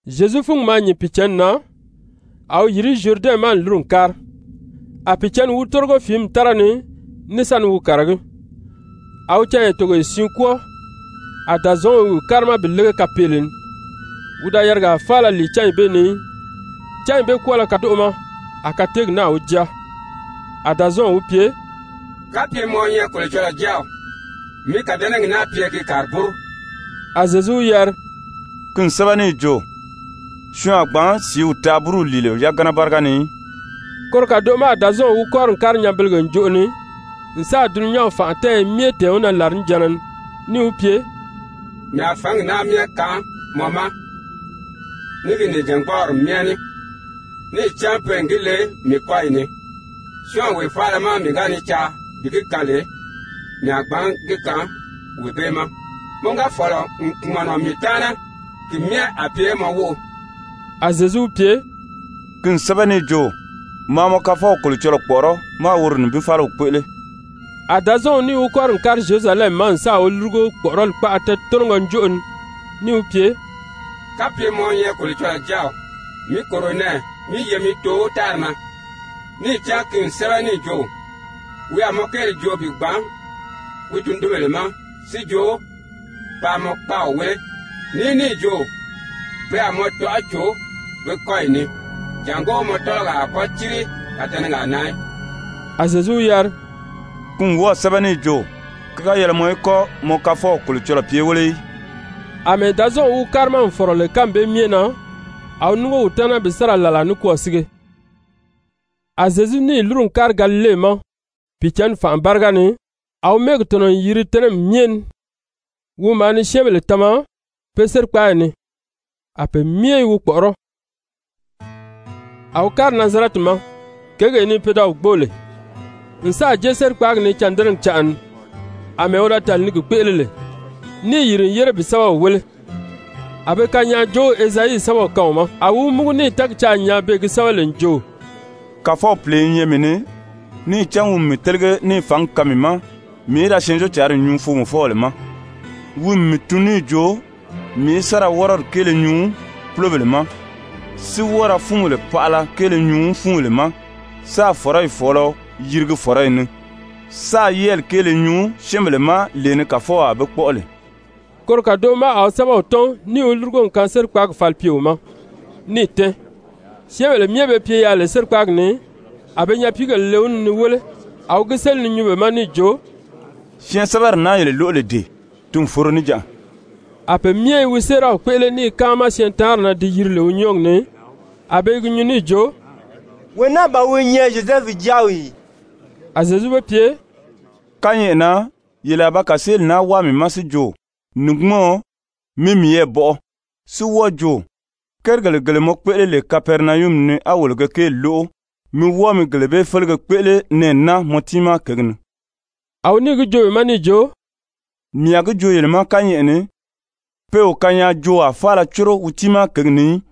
Zyezu fúngi maa nyìn Pìicǎnni na, a wi yìri Zyuridɛnw ma n lúru n kári. A Pìicǎnni wi tórigo fìími tára ni ní sa ni wi kàragí. A wi canya togoye siin kwɔ́ɔ, a Dàzɔɔnw i wi kárima bi lége kapeele ni. Wi da yarigaa faala lìi cányi bee ni í, cányi bee kwɔ́ɔlɔ kadoʔo ma a kateegi náà wi jáa. A Dàzɔɔnw wi pye: «Kapye mɔ wi nyɛ Kolocɔlɔɔ Jáaw, mi kàdɛnɛgi naa pye gi kàri búru.» A Zyezu wi yari: «Ki n sɛ́bɛ níì jo: ‹Syɔɔn a gbǎn sìíw taa búru lìile yagana báriga ni í.›» Koro kàdoʔo ma a Dàzɔɔnw wi kɔ́ri n kári nyanbelege ǹjoʔo ni n sáà dulunyanw fànʔa tɛ́ɛyɛ myɛ tɛ̀ɛn wi na làrinijanna ni níì wi pye: «Mii a fǎngi naa myɛ kaan mɔ ma ní gi nìjangbɔɔri myɛ ní. Níì cán pe n gi le mii kɔ́yi ni, syɔ́ɔnwee faala má mii ga ni caa bi gi kaan lè, mii a gbǎn gi kaan wee bee ma. Mɔ ga fɔ̀lɔ n kpùmɔnɔ mii taana, ki myɛ a pye mɔ wóʔo.» A Zyezu wi pye: «Ki n sɛ́bɛ níì jo: ‹Maa mɔ Kafɔw Kolocɔlɔɔ kpɔ̀ʔɔrɔ́ máā woro nibin fáliw kpéʔele.›» A Dàzɔɔnw níì wi kɔ́ri n kári Zyerusalɛmi ma n sáà wi lúrugo kpɔ̀ʔɔrɔli kpaʔa tɛ́ɛtɔnɔgɔ njoʔo ni níì wi pye: «Kapye mɔ wi nyɛ Kolocɔlɔɔ Jáaw, mi kòro nɛɛ, mí ye mi too tári na. Níì cán ki n sɛ́bɛ níì jo: ‹Wi a mɔ kéeli joo bi gbàn wi tundunbèle ma si jo paa mɔ kpáaw wéle.› Ní níì jo: ‹Pe a mɔ tɔʔɔ cò be kɔ́yi ni, jàngó mɔ tɔ́lɔgaa a kɔ́ círi kàdɛnɛgaa na í.›» A Zyezu wi yari: «Ki n wɔ́ɔ̀ sɛ́bɛ níì jo: ‹Ki ga yɛlɛ mɔ í kɔ́ mɔ Kafɔw Kolocɔlɔɔ pye wéle í.›» Amɛɛ Dàzɔɔnw wi kárima n fɔ̀rɔ lè kánmi bee myɛ na, a wi núngo wi taana bi sa ra làlaa nikwɔɔ sige. A Zyezu níì lúru n kári Galile ma Pìicǎnni fànʔa báriga ni, a wi mɛ́ɛgi tɔ̀nɔ n yiri tɛ́nɛmi myɛ ni. Wi maa ni syɛ́ɛnbèle tama pe sérikpaayi ni, a pe myɛ i wi kpɔ̀ʔɔrɔ́. A wi kári Nazarɛti ma, kěgee ni pe da wi gbóo lè, n sáà jée sérikpaagi ni cândɛnɛgi canʔa ni, àmɛɛ wi da tàli ni gi kpéʔele lè, níì yìri n yére bi sɛ́bɛw wéle. A be kanyaajoow Ezayi sɛ́bɛw kaan wi ma. A wi wi múgu níì tɛ́ɛgi caa n nyaa beè gi sɛ́bɛ lè n jo: «Kàfɔw Pìle i nyɛ mii ni, níì cán wi n mii télege níì fǎngi kaan mii ma mii í da Syɛɛnjóocǎnri nyuu foomɔfɔbèle ma. Wi n mii tun níì jo mii í sa ra wɔ́rɔdi kéele nyuu púlobèle ma, si wɔ́ɔ ra fúunbèle paʔala kéele nyuu fúunbèle ma, sáā fɔ̀rɔyi fɔ̀ɔlɔ yirigi fɔ̀rɔyi ni, sáā yɛ́ɛli kéele nyuu syɛ́ɛnbèle ma lee ni Kàfɔw a be kpɔ́ʔɔ lè.» Koro kàdoʔo ma a wi sɛ́bɛw tɔ́n níì wi lúrugo n kaan sérikpaagi falipyeo ma, níì tɛ́ɛn. Syɛ́ɛnbèle myɛ be pye yaà lè sérikpaagi ni, a be nyapiigèle le wi ni ni wéle. A wi gi séli ni nyuu be ma níì jo: «Syɛɛnsɛbɛri naa yele lóʔo lè dee, ti n foro níjanʔa.» A pe myɛ i wi séeraw kpéʔele ní i káama syɛɛntaanri na di yiri lè wi nyɔ́ɔgi ni. A be i gi nyuu níì jo: «Wee naa ban wi nyɛ Zyozɛfu jáaw ì?» A Zyezu be pye: «Kányɛʔɛ na yele a ba kàseeli naa wáa mii ma si jo: ‹Nìgbumɔɔn, mi miyɛɛ bɔʔɔ,› si wɔ́ɔ jo: ‹Kérigèle gele mɔ kpéʔele lè Kapɛrinayumi ni á wolo ge kéeli lóʔo, mi wɔ́ɔ mi gele bee félege kpéʔele nɛɛ naa mɔ tiimaa kěgi ni.›» A wi níì gi joo be ma níì jo: «Mii a gi joo yele ma kányɛʔɛ ni, pe o kanyaajoowaa faala córo wi tiimaa kěgi ni í.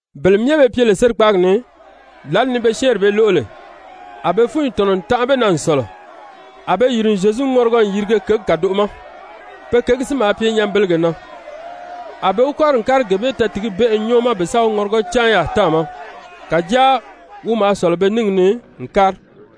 Bele myɛ be pye lè sérikpaagi ni, lǎli ni be syɛ́ɛnri bee lóʔo lè, a be fúnyi tɔ̀nɔ n tanʔa be na n sɔ̀lɔ. A be yìri n Zyezu ŋɔrigɔ n yirige kěgi kàdoʔo ma, pe kěgi si maa pye nyanbelege na, a be wi kɔ́ri n kári gee bee tɛɛtigibɛnʔɛ nyɔ́ɔ ma bi sa wi ŋɔrigɔ cáan yaà táàma. Kàjáa wi maa sɔ̀lɔ be níngi ni n kári.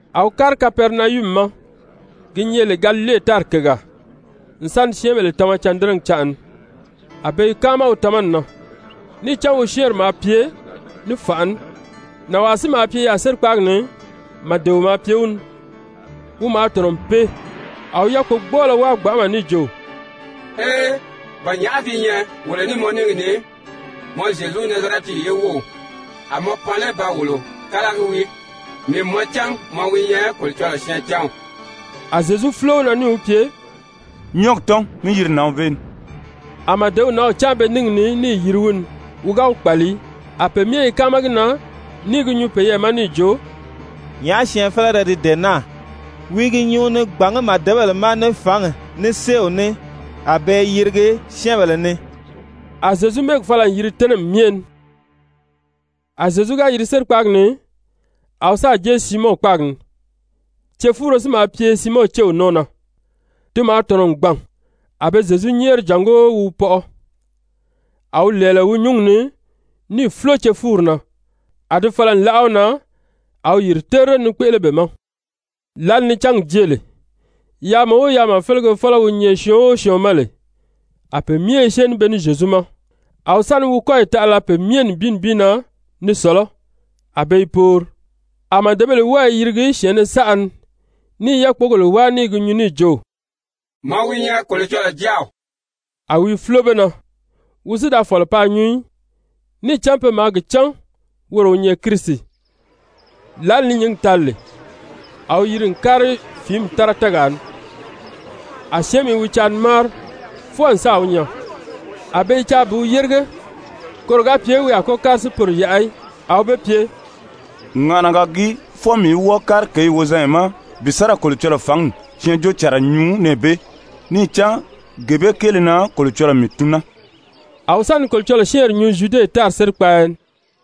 A wi kári Kapɛrinayumi ma, gi nyɛ lè Galile tári kègaa, n sa ni syɛ́ɛnbèle tama cândɛnɛgi canʔa ni. A be i káama wi tamani na, níì cán wi syɛ́ɛnri maa pye ní fànʔa ní. Nànwaa si maa pye yaà sérikpaagi ni, màdeo maa pye wi ni. Wi maa tɔ̀nɔ n pee. A wi yákpogbɔɔlɔ wáa gbanʔama níì jo: «Ee, ba nyàʔá gi nyɛ wolo ní mɔ níngi ni, mɔ Zyezu, Nazarɛti ye wów? A mɔ pan lé ba wolo kálagi wii? Mii n mɔ cán mɔ wi nyɛ Kolocɔlɔɔ syɛɛncanw.» A Zyezu fúlo wi na níì wi pye: «Nyɔ́ɔgi tɔ́n mí yiri nǎnw bee ni.» A màdew nǎnw cáan be níngi ni níì yiri wi ni. Wi ga wi kpàli í. A pe myɛ i káama gi na ní i gi nyuu peyɛɛ ma níì jo: «Nyàʔá syɛɛnfelere di dee naa? Wi i gi nyuu ni gbàngí màdebèle ma ní fǎngi, ní séew ní, a be i yirigi syɛ́ɛnbèle ni.» A Zyezu mɛ́ɛgi fala n yiri tɛ́nɛmi myɛ ni. A Zyezu ga yiri sérikpaagi ni, a wi sáà jée Siimɔn kpáagi ni. Cefuuro si maa pye Siimɔn céw nɔ́ɔ na, ti maa tɔ̀nɔ n gbàn, a be Zyezu nyɛ́ɛri jàngó wi wi pɔʔɔ. A wi lɛ̀ɛlɛ wi nyǔngi ni níì fúlo cefuuri na, a di fala n láʔa wi na. A wi yìri terire ni kpéʔele be ma. Lǎli ni cángi jée lè, yaama o yaama félege fɔ́lɔ wi nyɛ syɔɔn o syɔɔn ma lè, a pe myɛ i syée ní be ní Zyezu ma. A wi sa ni wi kɔ́yi taʔala pe myɛ na nibin nibin ni sɔ̀lɔ́, a be i poori. A màdebèle wɔ́ɔ i yirigi syɛ̀ɛnnɛ saʔa ni ní i yákpogèle wáa ni gi nyuu níì jo: «Mɔ wi nyɛ Kolocɔlɔɔ Jáaw.» A wi i fúlo be na. Wi si da fɔ̀lɔ paa nyuu í, níì cán pe maa gi cán woro wi nyɛ Kirisi. Lǎli ni nyǐngi tali lè, a wi yiri n kári fìími tára tɛ́ɛgaa ni. A syɛ́ɛnmi i wi caa ni máari fwɔɔ n sáà wi nyaa, a be i caa bi wi yérige koro ga pye wi a kɔ́ kári si poro yaʔa í. A wi be pye: «Ŋàʔanaga gii fwɔɔ mii í wɔ́ɔ kári kěyi wozanya ma bi sa ra Kolocɔlɔɔ fǎngi syɛɛnjóocànra nyuu nɛɛ bee. Níì cán gee bee kéele na Kolocɔlɔɔ mii tun naa.» A wi sa ni Kolocɔlɔɔ syɛ́ɛnri nyuu Zyude tári sérikpaaya ni.